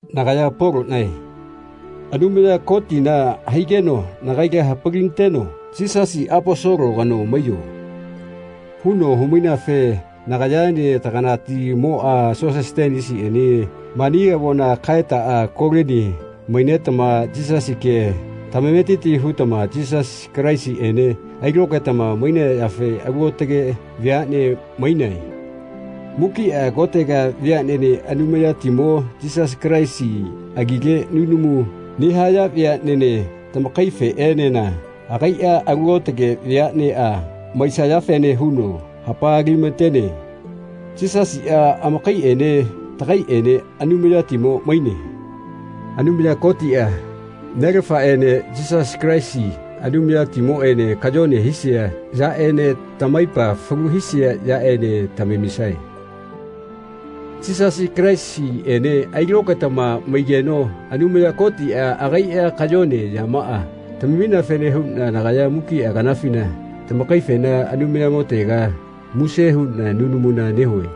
Nagaya Poloꞌnae. Anumaya Kotina haigeno nagaila hapalinateno “Yisasi Aposolo kano maiyo.” huno humaineafe nagayaene taganatimoꞌa Sosetenesiꞌene mani avona kaetaꞌa Kolini mainetama Yisasi kea tamametiti hutama Yisasi Kalaisiꞌene ailokaetama mainayafe alu aotage veaꞌne mainae. Mukiꞌa kotega veaꞌnene Anumayatimo Yisasi Kalaisi agile nunamu nehaya veaꞌnene tamakaifeꞌenena agaiꞌa alu aotage veaꞌneꞌa maisayafene huno hapalilamatene. Yisasiꞌa amakaiꞌene tagaiꞌene Anumayatimo maine. Anumaya Kotiꞌa, Nelafaꞌene Yisasi Kalaisi Anumayatimoꞌene kayone hisaya yaꞌene tamaipa falu hisia yaꞌene tamamisaꞌe. Yisasi Kalaisiꞌene ailokaetama maigeno Anumaya Kotiꞌa agaiꞌa kayone yamaꞌa tamamineafene huꞌna nagaya mukiꞌa kanafina tamakaifena Anumayamotega muse huꞌna nunamuna nehue.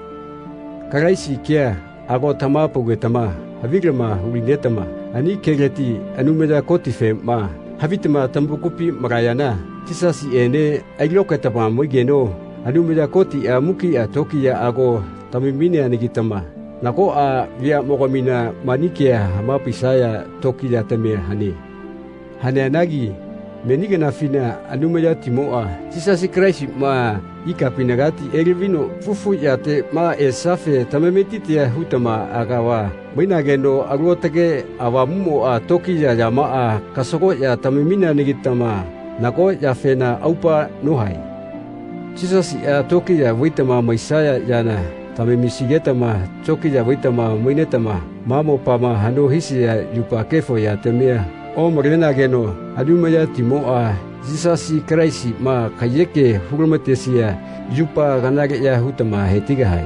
Kalaisi kea ago tamahapaugetama havilama hulinetama ani keleti Anumaya Kotifema havitama tamakupi malayana Yisasiꞌene ailokaetama maigeno Anumaya Kotiꞌa mukiꞌa tokiyaꞌa ago tamamineanagitama nagoꞌa veaꞌmogamina mani kea hamapaisaya tokiyatamia hane. Haneanagi meni kanafina Anumayatimoꞌa Yisasi Kalaisiꞌma ikapinagati elavino fufu yateꞌma esiafe tamametitia hutama agava mainageno Alu Aotage Avamuꞌmoꞌa tokiya yamaꞌa kasagoꞌya tamamineana-gitama nago yafena aupa nohae. Yisasiꞌa tokiya vaitama maisaya yana tamamisigetama tokiya vaitama mainetama ma mopama haꞌno hisia yupa kefo yatamia omalenageno Anumayatimoꞌa Yisasi Kalaisiꞌma kaiyeke hulamatesia yupa kanaleꞌya hutama hetigahae.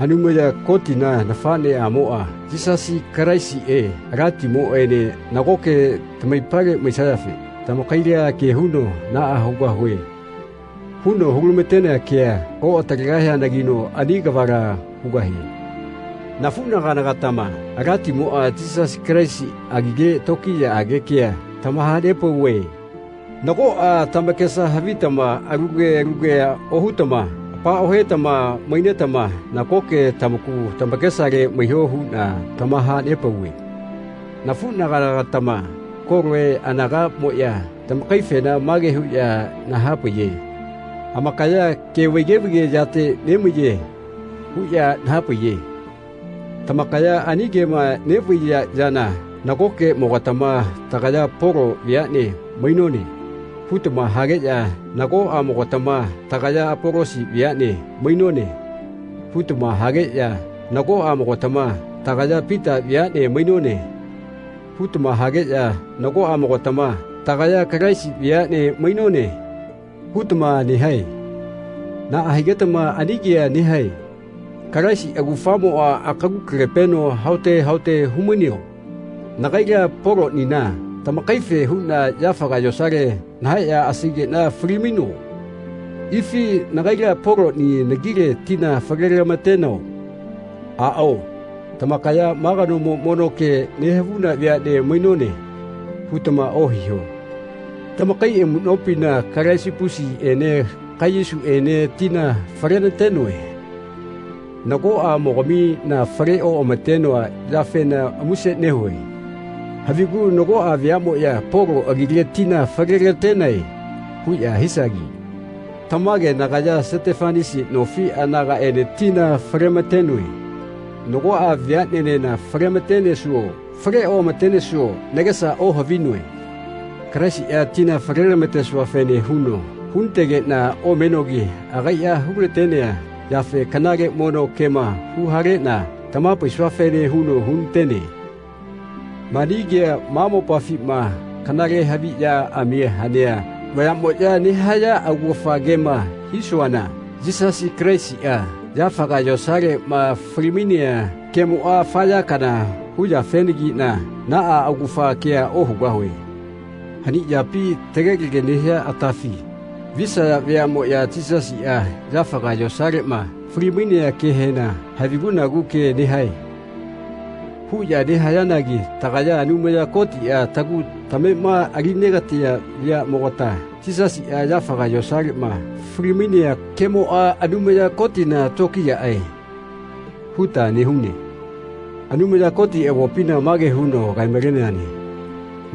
Anumaya Kotina nafaꞌneꞌamoꞌa Yisasi Kalaisiꞌe Alatimoꞌene nagoke tamaipale maisayafe tamakaila ke huno “Naꞌa hugahue.” huno hulamatenea kea oꞌatalegahianagino ani kavala hugahie. Nafuꞌnagana-gatama Alatimoꞌa Yisasi Kalaisi agile tokiyaꞌage kea tamahanepauve. Nagoꞌa tamakesa havitama alu ke alu kea ohutama apaohetama mainetama nagoke tamaku tamakesale maiho huꞌna tamahanepauve. Nafuꞌnagana-gatama Koloe anagaꞌmoꞌya tamakaifena mage huꞌya nahapaiye “Amakaya ke vaige vaige yate nemaiye.” huꞌya nahapaiye. Tamakaya ani kema neꞌvaiya yana nagokeꞌmogatama “Tagaya Polo veaꞌne mainone.” hutama hageꞌya nagoꞌamogatama “Tagaya Apolosi veaꞌne mainone.” hutama hageꞌya nagoꞌamogatama “Tagaya Pita veaꞌne mainone.” hutama hageꞌya nagoꞌamogatama “Tagaya Kalaisi veaꞌne mainone.” hutama nehae. Naꞌa higetama ani kea nehae? Kalaisi augafamoꞌa akalu kale-peno haote haote humaineo? Nagaila Polonina tamakaife huꞌna yafaga yosale nahaeꞌya asaigeꞌna fali-maino? Ifi nagaila Poloni nagile tina fale-lamatenao? Aꞌao tamakaya “Ma kanomo mono ke nehavuna veaꞌne mainone.” hutama ohiho. Tamakai amuꞌnopina Kalisipusiꞌene Kaiyusiꞌene tina falenatenoe. Nagoꞌamogamina fale oꞌamatenoa yafena muse nehue. Havigu nagoꞌa veaꞌmoꞌya “Polo agile tina falelatenae.” huꞌya hisagi. Tamage nagaya Setefanasi nofi anagaꞌene tina falematenoe. Nagoꞌa veaꞌnenena falematenesuo fale oꞌamatenesuo nagesa ohavinoe. Kalaisiꞌa tina falelamatesuafene huno hunategeꞌna omenogi agaiꞌa hulatenea yafe kanale mono kema huhaleꞌna tamahapaisuafene huno hunatene. Mani kea ma mopafima kanalehaviꞌyaꞌami hanea vayaꞌmoꞌya nehaya augafa kema hisuana Yisasi Kalaisiꞌa yafaga yosaleꞌma fali-mainea kemoꞌa afa ya kana hu yafenagiꞌna naꞌa augafa kea ohugahue. Hani yapi, tegelege nehia atafi, visaya veaꞌmoꞌya Yisasiꞌa yafaga yosaleꞌma fali-mainea kehena “Havigu-nagu ke nehae.” huꞌya nehayanagi tagaya Anumaya Kotiꞌa tagu tamema ali negatea veaꞌmogata Yisasiꞌa yafaga yosaleꞌma fali-mainea kemoꞌa “Anumaya Kotina tokiyaꞌae.” huta nehune. Anumaya Koti avopina mage huno kae-maleneane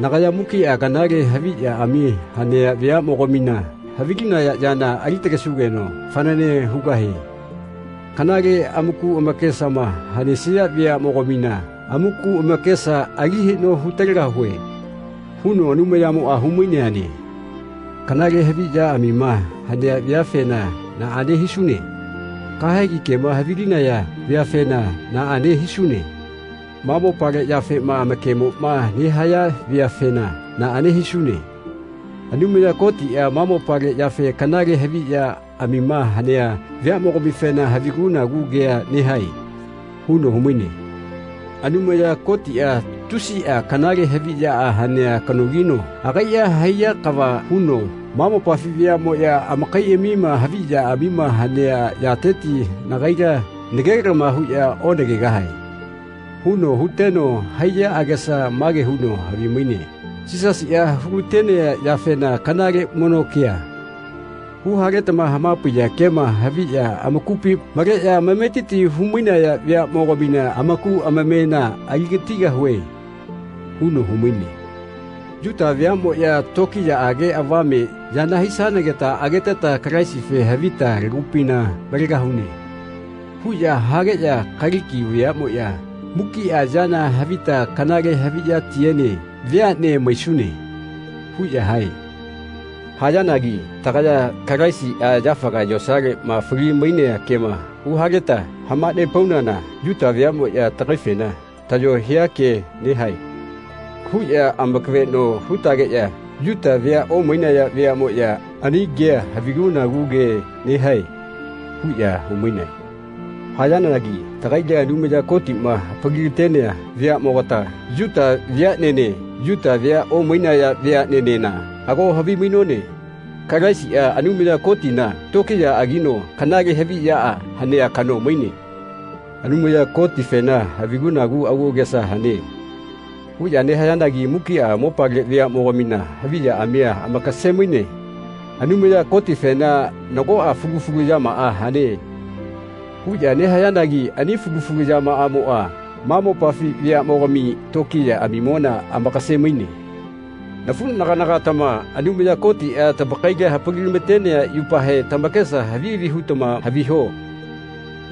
“Nagaya mukiꞌa kanale haviꞌyaꞌami hanea veaꞌmogamina havilinaya yana alitalesugeno fanane hugahie. Kanale amaku amakesama hanesia veaꞌmogamina amaku amakesa ali haꞌno hutalegahue.” huno Anumayamoꞌa humaineane. Kanale haviꞌyaꞌamima hanea veafena naꞌane hisune? Kahegi kema havilinaya veafena naꞌane hisune? Ma mopale yafema amakemoꞌma nehaya veafena naꞌane hisune? Anumaya Kotiꞌa ma mopale yafe kanale haviꞌyaꞌamima hanea veaꞌmogamifena “Havigu-nagu ke nehae.” huno humaine. Anumaya Kotiꞌa tusiꞌa kanale haviꞌyaꞌa hanea kanogino agaiꞌa haiya kava huno “Ma mopafi veaꞌmoꞌya amakaiꞌami haviꞌyaꞌamima hanea yateti nagaila nagelama huꞌya onagegahae.” huno huteno haiya agesa mage huno havimaine “Yisasiꞌa hulatenea yafena kanale mono kea, huhaletama hamapaiya kema haviꞌya amakupi maleꞌya amametiti humainaya veaꞌmogamina amaku amamena aligatigahue.” huno humaine. Yuta veaꞌmoꞌya “Tokiyaꞌage avame yana hisanageta ageteta Kalaisife havita lagupina malegahune.” huꞌya hageꞌya Kaliki veaꞌmoꞌya “Mukiꞌa yana havita kanale haviꞌyatiene veaꞌne maisune.” huꞌya hae. Hayanagi tagaya Kalaisiꞌa yafaga yosaleꞌma fali-mainea kema huhaleta hamanepaunana Yuta veaꞌmoꞌya tagaifena “Tayo hia ke nehae.” huꞌya amakaveꞌno hutageꞌya Yuta vea omainaya veaꞌmoꞌya “Ani kea havigu-nagu ke nehae.” huꞌya humainae. Hayanagi tagaila Anumaya Kotiꞌma hapalilatenea veaꞌmogata, Yuta veaꞌnene Yuta vea omainaya veaꞌnenena, ago havimainone Kalaisiꞌa Anumaya Kotina tokiyaꞌagino kanale haviꞌyaꞌa hanea kano maine. Anumaya Kotifena “Havigu-nagu agu agesa hane.” huꞌya nehayanagi mukiꞌa mopale veaꞌmogamina haviꞌyaꞌami amakase-maine. Anumaya Kotifena “Nagoꞌa fulu fulu yamaꞌa hane.” huꞌya nehayanagi ani fulu fulu yamaꞌamoꞌa ma mopafi veaꞌmogami tokiyaꞌamimona amakase-maine. Nafuꞌnagana-gatama Anumaya Kotiꞌa tamakaila hapalilamatenea yupahe tamakesa havi havi hutama haviho.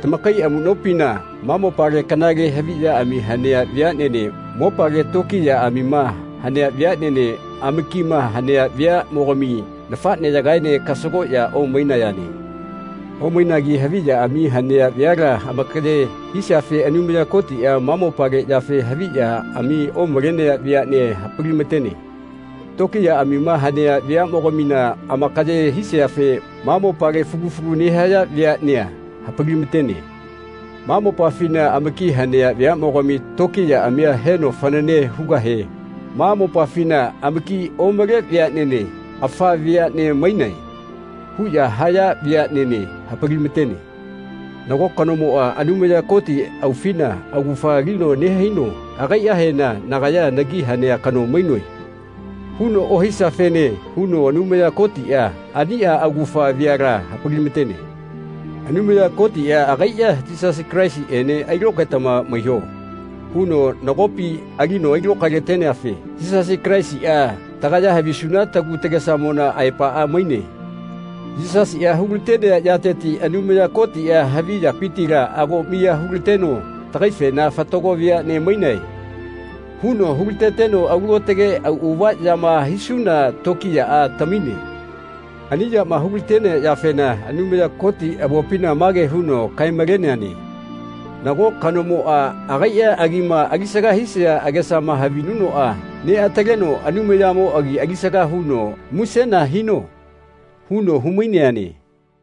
Tamakai amuꞌnopina ma mopale kanale haviꞌyaꞌami hanea veaꞌnene mopale tokiyaꞌamima hanea veaꞌnene amakima hanea veaꞌmogami nafaꞌneyagaene kasagoꞌya omainayane. Omainagi haviꞌyaꞌami hanea veala amakaye hisiafe Anumaya Kotiꞌa ma mopale yafe haviꞌyaꞌami omalenea veaꞌnea hapalimatene. Tokiyaꞌamima hanea veaꞌmogamina amakaye hisiafe ma mopale fulu fulu nehaya veaꞌnea hapalimatene. Ma mopafina amaki hanea veaꞌmogami tokiyaꞌamia heno fanane hugahe ma mopafina amaki omale veaꞌnene “Afa veaꞌne mainae.” huꞌya haya veaꞌnene hapalimatene. Nago kanomoꞌa Anumaya Koti aufina augafa alino nehaino agaiꞌahena “Nagaya nagi hanea kano mainoe.” huno ohisiafene huno Anumaya Kotiꞌa aniꞌa augafa veala hapalimatene. Anumaya Kotiꞌa agaiꞌa “Yisasi Kalaisiꞌene ailokaetama maiho.” huno nagopi alino ailokaelateneafe Yisasi Kalaisiꞌa tagaya havisuna tagu tagesamona aepaꞌa maine. Yisasiꞌa hulatenea yateti Anumaya Kotiꞌa havi yapitila ago miya hulateneno tagaifena “Fatago veaꞌne mainae.” huno hulateteno alu aotage auꞌava yama hisuna tokiyaꞌa tamine. Ani yama hulatenea yafena Anumaya Koti avopina mage huno kae-maleneane “Nago kanomoꞌa agaiꞌa agima alisaga hisia agesama havinunoꞌa neꞌataleno Anumayamo agi alisaga huno musena hino.” huno humaineane.